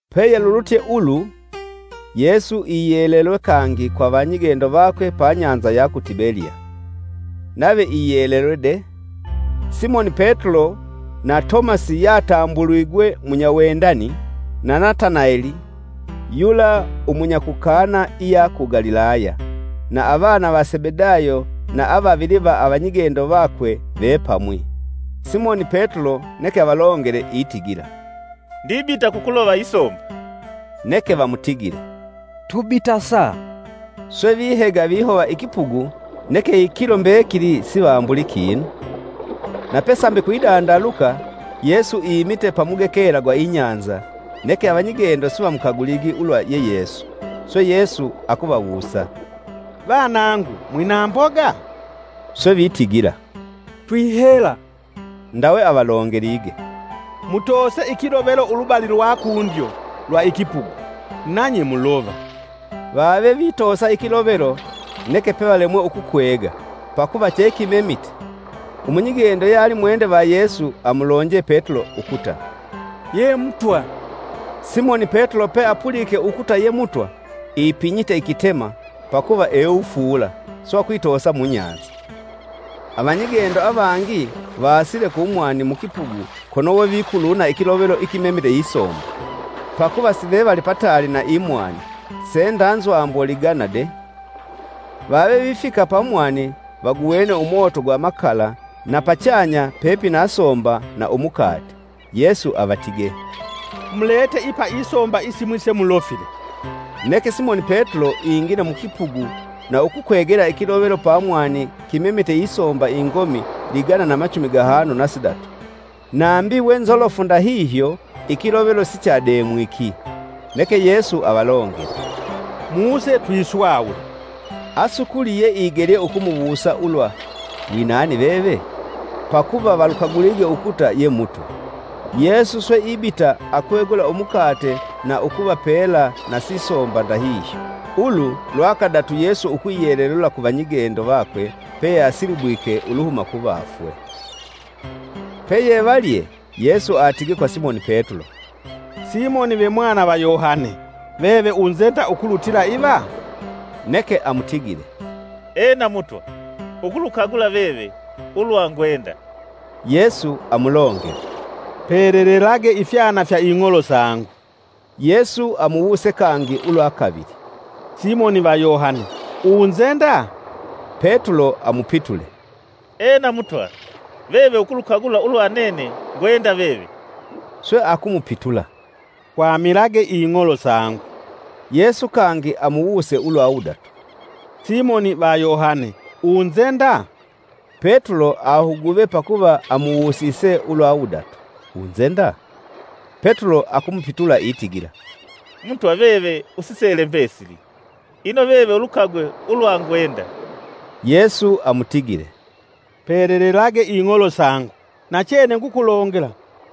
Peyelulutye ulu, Yesu iyelelwe kangi kwa avanyigendo vakwe pa nyanza ya ku Tibeliya. Nave iyelelwe de: Simoni Petulo na Tomasi (yatambuligwe munyawendani), na Nataneli (yula umunya ku Kana iya ku Galilaya) na avana va Sebedayo na avavili va avanyigendo vakwe vepamwi. Simoni Petulo neke avalongele itigila, “Ndibita kukulova isomba.” Neke vamutigile, “Tubitasa.” Swe vihega vihova ikipugu neke ikilo mbekili sivambulii kinu. Na pesambi kwidandaluka, Yesu imite pamugekela gwa inyanza, neke avanyigendo sivamukaguligi ulwa ye Yesu. Swe Yesu akuvawusa, “Vanangu mwina mboga?” Swe vitigila, “Twihela.” Ndawe avalongelige, “Mutoose ikilovelo ulubali lwa kundyo, lwa ikipugu, nanye mulova.” Vave vitoosa ikilovelo neke pe valemwe ukukwega, pakuva chekimemite. Umunyigendo yealimwende va Yesu amulonje Petulo ukuta, “Ye Mutwa.” Simoni Petulo peapulike ukuta ye Mutwa ipinyite ikitema (pakuva ewufuula) swe akwitoosa munyanza. Avanyigendo avangi vaasile kumwani mukipugu kono wevikuluna ikilovelo ikimemile isomba; pakuva sivevali pataali na imwani se nda nzwambo ligana de. Vave vifika pa mwani vaguwene umoto gwa makala na pachanya pepina somba na umukate. Yesu avatige, “Mulete ipa isomba isimwi se mulofile.” Neke Simoni Petulo ingile mukipugu na ukukwegela ikilovelo pamwani kimemite isomba ingomi ligana na machumi gahanu na sidatu; nambi we nzolofu ndahihyo ikilovelo sichademwiki. Neke Yesu avalongele, “Muse twiswawule.” Asukuli yeigelye ukumuwusa ulwa: “Winani veve?” Pakuva valukagulige ukuta ye Mutwa. Yesu swe ibita akwegula umukate na ukuvapela na sisomba ndahihyo. Ulu lwa kadatu Yesu ukwiyelelula ku vanyigendo vakwe peyeasilibwike uluhuma kuvafwe. Peyevalye, Yesu atige kwa Simoni Petulo, “Simoni ve mwana va Yohane! Veve unzenda ukulutila iva?” Neke amutigile, “Ena, Mutwa; ukulukagula veve. Ulwa ngwenda” Yesu amulongele, “Pelelelage ifyana fya ing'olo sangu.” Yesu amuwuse kangi ulwa kavili, “Simoni va Yohane! Unzenda?” Petulo amupitule, “Ena, Mutwa veve ukulukagula ulwa nene ngwenda veve.” Sweakumupitula, “Kwamilage Ing'olo sangu.” Yesu kangi amuwuse ulwa wudatu, “Simoni va Yohane! unzenda?” Petulo ahuguve pakuva amuwusise ulwa wudatu, “Unzenda?” Petulo akumupitula itigila, “Mutwa veve usisele mbesili, ino veve ulukagwe ulwa ngwenda.” Yesu amutigile, “Pelelelage ing'olo sangu! Nachene ngukulongela,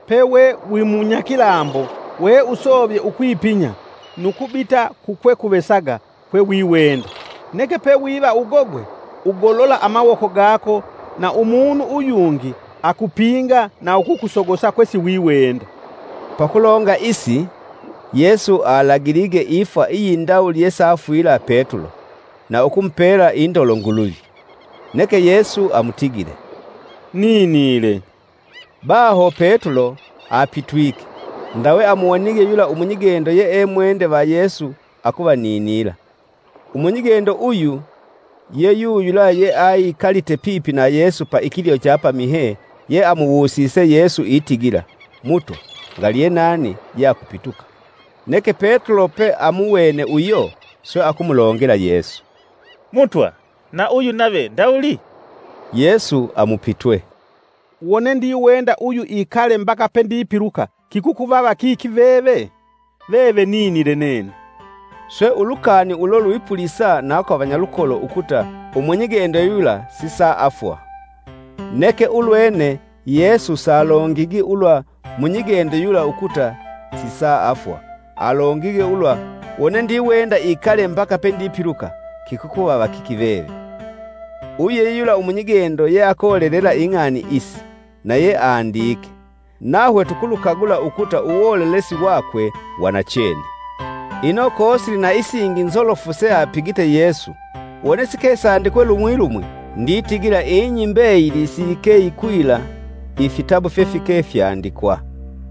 pewe wimunyakilambo weusovye ukwipinya, nu kubita kukwekuvesaga kwewiwenda. Neke pewiva ugogwe, ugolola amawoko gako na umunu uyungi akupinga na ukukusogosa kwe siwiwenda.” ( Pakulonga isi Yesu alagilige ifwa iyindawuli yesafwila Petulo na ukumupela indolo Nguluvi.) Neke Yesu amutigile, “Ninile!” Baho Petulo apitwike, ndawe amuwonige yula umunyigendo yeemwende va Yesu, akuvaninila. Umunyigendo uyu, ye yuyula yeali ikalite pipi na Yesu pa ikilyo cha pamihye, yeamuwusise Yesu itigila, “Mutwa ngali ye nani yeakupituka.” Neke Petulo peamuwene uyo swe akumulongela Yesu, “Mutwa na uyu nave ndawuli?” Yesu amupitwe, “Wone ndiwenda uyu ikale mbaka pendipiluka kikuvava kiki veve? Veve ninile nene.” Swe ulukani ulo lwipulisa na kwa vanyalukolo ukuta umunyigendo yula sisaafwa. Neke ulwene Yesu salongigi ulwa munyigendo yula ukuta sisaafwa, alongige ulwa, “Wone ndiwenda ikale mbaka pendipiluka kikuvava kiki veve.” Uyu ye yula umunyigendo yeakolelela ing'ani isi, na ye andike. Nahwe tukulukagula ukuta uwolelesi wakwe wa nachene. Ino, kosili na isingi nzolofu seapigite Yesu wone sikesandikwe lumwi, lumwi, nditigila ing'i mbeyili siyike yikwila ifitabu fyefike fyandikwa.